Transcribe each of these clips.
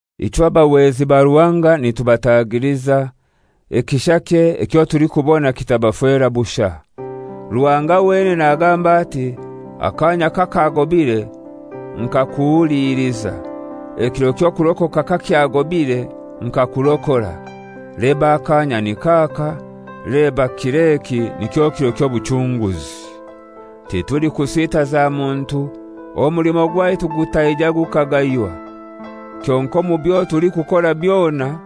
Ichwe abahwezi ba Ruhanga nitubatagiliza, ekishakye ekyo tulikubona kitabafera bushai. Ruhanga wenene nagamba ati, «Akanya kakagobire nkakuhuliliza, ekiro ky'okurokoka kakyagobire nkakurokora.» Leba akanya nik'aka; leba kir'eki nikyo kiro ky'obuchunguzi. Titulikusitaza muntu, omulimo gwaitu gutaija gukagaywa. Kyonkai omu byo tulikukora byona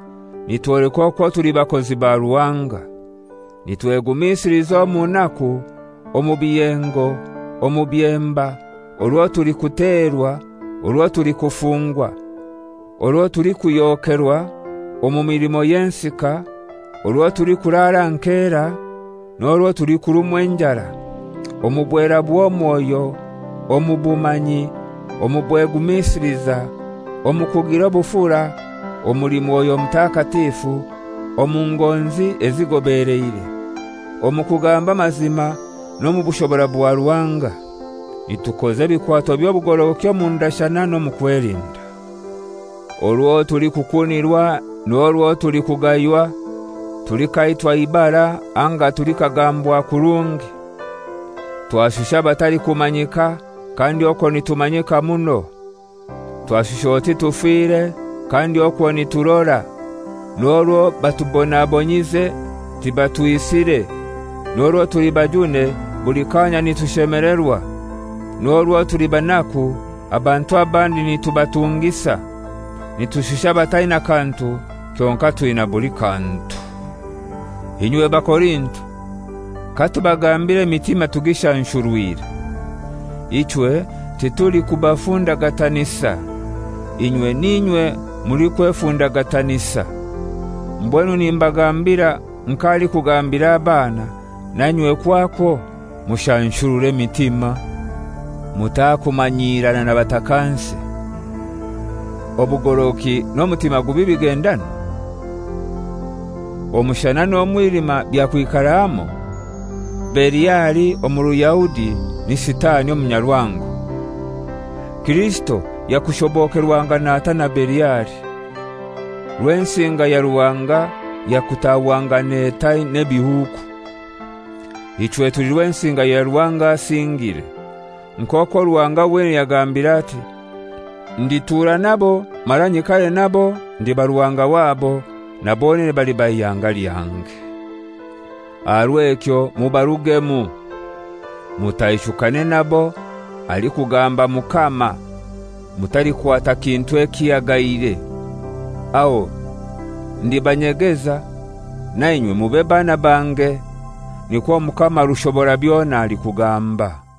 nitwoleka okwo tuli bakozi ba Ruhanga: Nitwegumisiliza omu naku, omu biyengo, omu byemba, orwo tulikuterwa, orwo tulikufungwa, orwo tulikuhyokerwa, omu milimo y'ensika, orwo tulikuraara aha nkera, n'orwo tulikurumwa enjara; omu bwera bw'omwoyo, omu bumanyi, omu bwegumisiliza, omu kugira obufura, omuli Mwoyo Mutakatifu, omu ngonzi ezigobeleire; omu kugamba amazima, n'omu bushobora bwa Ruhanga; nitukoza ebikwato by'obugorogoki omu ndashana n'omu kwelinda; orwo tulikukunirwa n'orwo tulikugaywa, tulikaitwa ibara anga tulikagambwa kurungi. Twashusha abatalikumanyika, kandi okwo nitumanyika muno; twashusha oti tufire, kandi okwo niturora. N'orwo batubonabonyize tibatwisire. N'orwo tuli bajune, buli kanya nitushemelerwa. N'orwo tuli banaku, abantu abandi nitubatungisa, nitushusha abataina kantu, kyonkai twina buli kantu. Inywe Bakorinto, katubagambire emitima tugishanshurwire. Ichwe titulikubafundagatanisa. Inywe n'inywe mulikwefundagatanisa. Mbwenu nimbagambira nk'alikugambira abaana; na inywe kwakwo mushanshurure emitima. Mutakumanyirana na batakansi. Obugorogoki n'omutima gubi bigendanwa? Omushana n'omwilima byakwikara hamoi? Beliali omu Ruyahudi ni Sitani omunyarwango. Kirisito yakushobokerwangana atai na Beliali? Rwensinga ya Ruhanga yakutahwangana etai n'ebihuuku? Ichwe tuli Rwensinga ya Ruhanga asingire; nk'okwo Ruhanga wenene yagambire ati, «Nditura nabo mara nyikare nabo, ndiba Ruhanga wabo, na bonene baliba ihanga lyange. Aha rw'ekyo mubarugemu, mutaishukane nabo, alikugamba Mukama, mutalikwata kintu ekihagaire; aho ndibanyegeza, na inywe mube baana bange; nikwo Omukama Rushoborabyona alikugamba.»